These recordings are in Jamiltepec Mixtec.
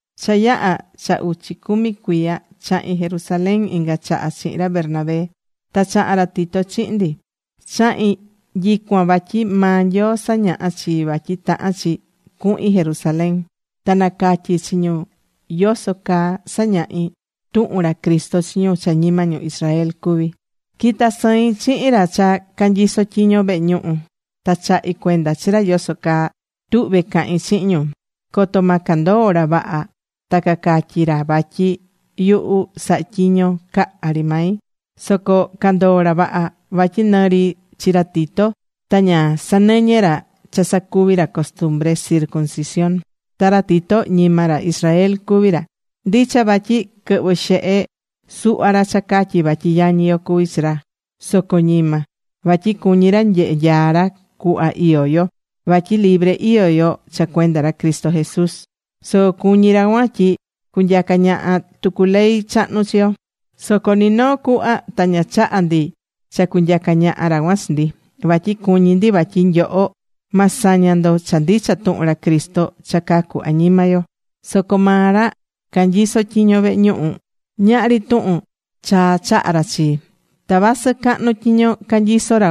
Cha yaha̱ cha uchi cumi cuiya, chahi̱n Jerusalén inga chaha chihin ra Bernabé. Ta chaha̱n ra Tito chihin ndi. Chahi̱n nyicuan vatyi maa Nyoo sañaha̱ chii vatyi tahán chi cuhin Jerusalén. Ta nacatyi̱ chi ñu yoso caa sañahí tuhun ra Cristo chi ñu cha ñima ñu Israel cuví. Quita̱ sɨin chihin ra cha canyiso tyiño vehe ñuhu, ta chahi̱ cuenda chi ra yoso caa tuhvé cahin chihin ñu. Coto ma candoo ra vaha ta cacatyi ra vatyi yuhu sahá tyiño caha ri mai. Soco candoo̱ ra vaha. Vatyi nɨ ri chi ra Tito ta ña sanɨñɨ̱ ra cha sacuvi ra costumbre circuncisión. Ta ra Tito ñima ra Israel cuví ra. Ndicha vatyi quɨhvɨ̱ xehe suhva ra cha catyí vatyi yañi yo cuví chi ra, soco ñima. Vatyi cuñí ra nyehe nyaa ra cuhva iyó yo. Vatyi libre iyó yo cha cuenda ra Cristo Jesús. Soco cuñí ra cuan tyi cunyaca ñaha tucu ley chahnu chi yo. Soco ni noo cuhva ta ña chaha̱ ndi cha cunyaca ñaha ra cuan chi ndi. Vatyi cuñí ndi vatyi nyoho ma saña ndo cha ndicha tuhun ra Cristo cha cacu añima yo. Soco maa ra canyisó tyiño vehe ñuhu, ñahri tuhun chaa chaha̱ ra chii. Ta vasɨ cahnu tyiño canyisó ra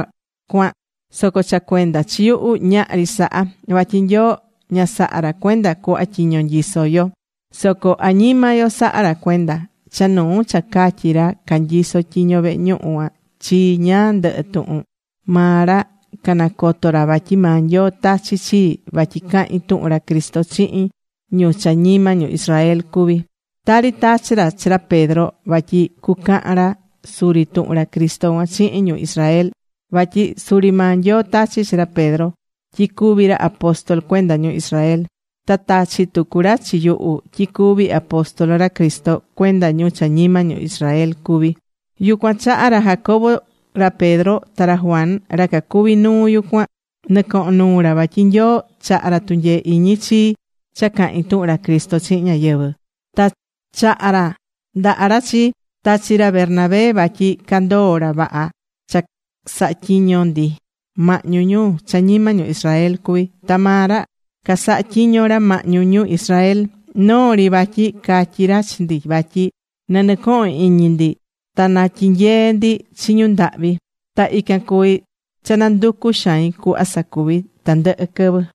cuan, soco cha cuenda chi yuhu, ñahri saha. Vatyi Nyoo ña sahá ra cuenda cuhva tyiño nyisó yo. Soco añima yo sahá ra cuenda. Cha nuu cha catyi̱ ra canyiso tyiño vehe ñuhu cuan chii ñáá ndɨhɨ tuhun, maa ra canacoto̱ ra vatyi maa Nyoo tachi̱ chii vatyi cahín tuhun ra Cristo chihin ñu cha ñima ñu Israel cuví. Tari tachi̱ ra chi ra Pedro vatyi cucahan ra suri tuhun ra Cristo cuan chihin ñu Israel. Vatyi suri maa Nyoo tachi̱ chi ra Pedro tyi cuví ra apóstol cuenda ñu Israel. Ta tachi̱ tucu ra chi yuhu tyi cuví apóstol ra Cristo cuenda ñu cha ñima ñu Israel cuví. Yucuan chaha ra Jacobo, ra Pedro ta ra Juan ra cacuví nuu yucuan, nɨcohón nuu ra vatyi Nyoo chahá ra tunyee iñi chii cha cahín tuhun ra Cristo chihin ñáyɨvɨ. Ta chaha̱ ra ndaha ra chii, ta chi ra Bernabé vatyi candoo̱ ra vaha cha sahatyiño ndi mahñu ñu cha ñima ñu Israel cuví. Ta maa ra casahatyiño ra mahñu ñu Israel. Noo ri vatyi catyi̱ ra chi ndi vatyi na nɨcohon iñi ndi ta natyinyee ndi chi ñu ndahvi. Ta ican cuvi cha nanducú xain cuhva sacuví tandɨhɨ quɨvɨ.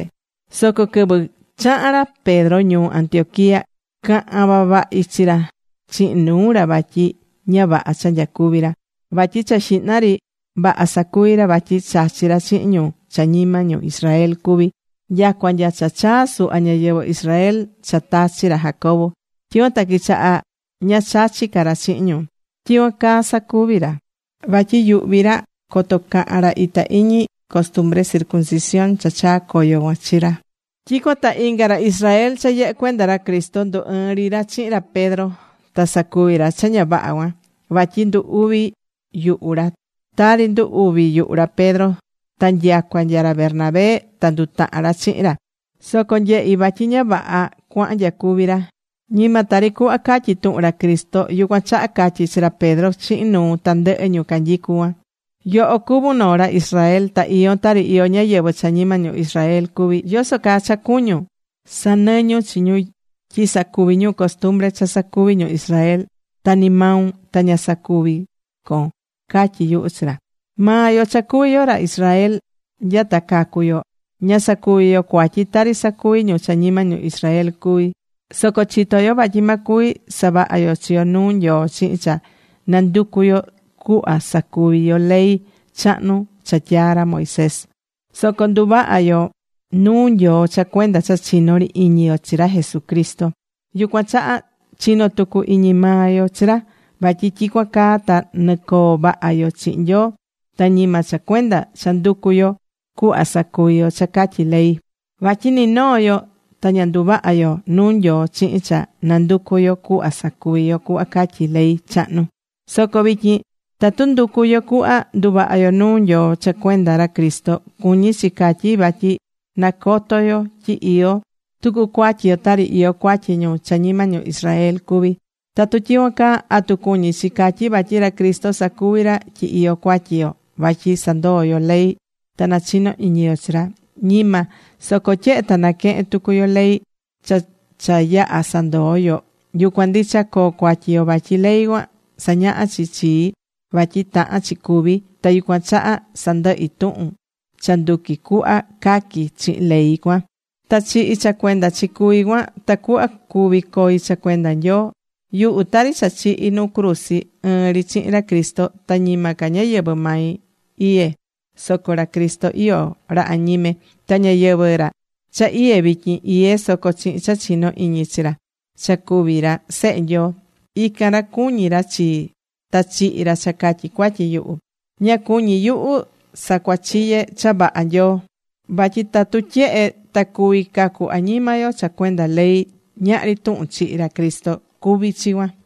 Soco quɨvɨ chaha̱n ra Pedro ñuu Antioquía, caha̱n vavahi chi ra chihin nuu ra vatyi ña vaha cha nyacuví ra. Vatyi cha xihna ri vaha sacuvi̱ ra vatyi chachi̱ ra chihin ñu cha ñima ñu Israel cuví, nyacua nya cha chaa̱ suhva ñáyɨvɨ Israel cha tachi̱ ra Jacobo. Tyicuan ta quichaha ña chachí ca ra chihin ñu. Tyicuan caa sacuvi̱ ra vatyi yuhví ra coto cahan ra itá iñi costumbre circuncisión cha chaa̱ coyo cuan chi ra. Tyicuan ta inga ra Israel cha yɨhɨ́ cuenda ra Cristo ndu ɨɨ̱n ri ra chihin ra Pedro. Ta sacuvi̱ ra cha ña vaha cuan. Vatyi ndu uvi̱ yuhu ra tari ndu uvi̱ yuhu ra Pedro. Ta nyacua nya ra Bernabé ta ndutaha̱n ra chihin ra. Soco nyehi̱ vatyi ña vaha cuahán nyacuvi ra. Ñima tari cuhva catyí tuhun ra Cristo. Yucuan chaha catyi̱ chi ra Pedro chihin nuu tandɨhɨ ñu canyicu cuan: “Yoho cuvún noo ra Israel. Ta iyón tari iyó ñáyɨvɨ cha ñima ñu Israel cuví. ¿Yoso caa cha cuñún sanɨñun chi ñu tyi sacuvi ñu costumbre cha sacuvi ñu Israel? Ta ni maun ta ña sacuví con”, catyi yuhu chi ra. Maa yo cha cuví yo ra Israel nya ta cacu̱ yo, ña sacuví yo cuatyi tari sacuví ñu cha ñima ñu Israel cuví. Soco chitó yo vatyi ma cuvi saváha yo chi yo nuu Nyoo chihin cha nanducú yo cuhva sacuvi yo ley chahnu cha tyaa̱ ra Moisés. Soco nduvahá yo nuu Nyoo cha cuenda cha chinó ri iñi yo chi ra Jesucristo. Yucuan chaha chinó tucu iñi maa yo chi ra. Vatyi tyicuan caa ta nɨcoo vaha yo chihin Nyoo. Ta ñima cha cuenda cha nducú yo cuhva sacuvi yo cha catyí ley. Vatyi ni noo yo ta ña nduvahá yo nuu Nyoo chihin cha nanducú yo cuhva sacuvi yo cuhva catyí ley chahnu. Soco vityin tatu nducú yo cuhva nduvaha yo nuu Nyoo cha cuenda ra Cristo, cuñí chi catyi vatyi nacoto yo tyi iyó tucu cuatyi yo tari iyó cuatyi ñu cha ñima ñu Israel cuví. Tatu tyicuan caa, ¿atu cuñí chi catyi vatyi ra Cristo sacuví ra tyi iyó cuatyi yo vatyi sandoo̱ yo ley ta nachino iñi yo chi ra? Ñima. Soco tyehe ta naquehen tucu yo ley cha cha yaha̱ sandoo̱ yo, yucuan ndicha coo cuatyi yo. Vatyi ley cuan sañahá chi chii vatyi tahán chi cúvi, ta yucuan chaha sandɨhi̱ tuhun cha nduqui cuhva caqui chihin ley cuan, ta chihi̱ cha cuenda chi cuví cuan, tacuhva cuvi coi cha cuenda Nyoo. Yuhu, tari cha chihi̱ nuu cruzi ɨɨn ri chihin ra Cristo. Ta ñima ca ñayɨvɨ̱ mai iyé soco ra Cristo iyó ra añime. Ta ñayɨvɨ̱ ra cha iyé vityin, iyé soco chihin cha chinó iñi chi ra cha cuví ra Sehe Nyoo. Ican ra cuñí ra chii, ta chihi̱ ra cha catyi cuatyi yuhu. Ña cuñí yuhu sacuachiye cha vaha Nyoo. Vatyi tatu tyehe ta cuví cacu añima yo cha cuenda ley, ñahri tuhun chihi̱ ra Cristo cuví chi cuan.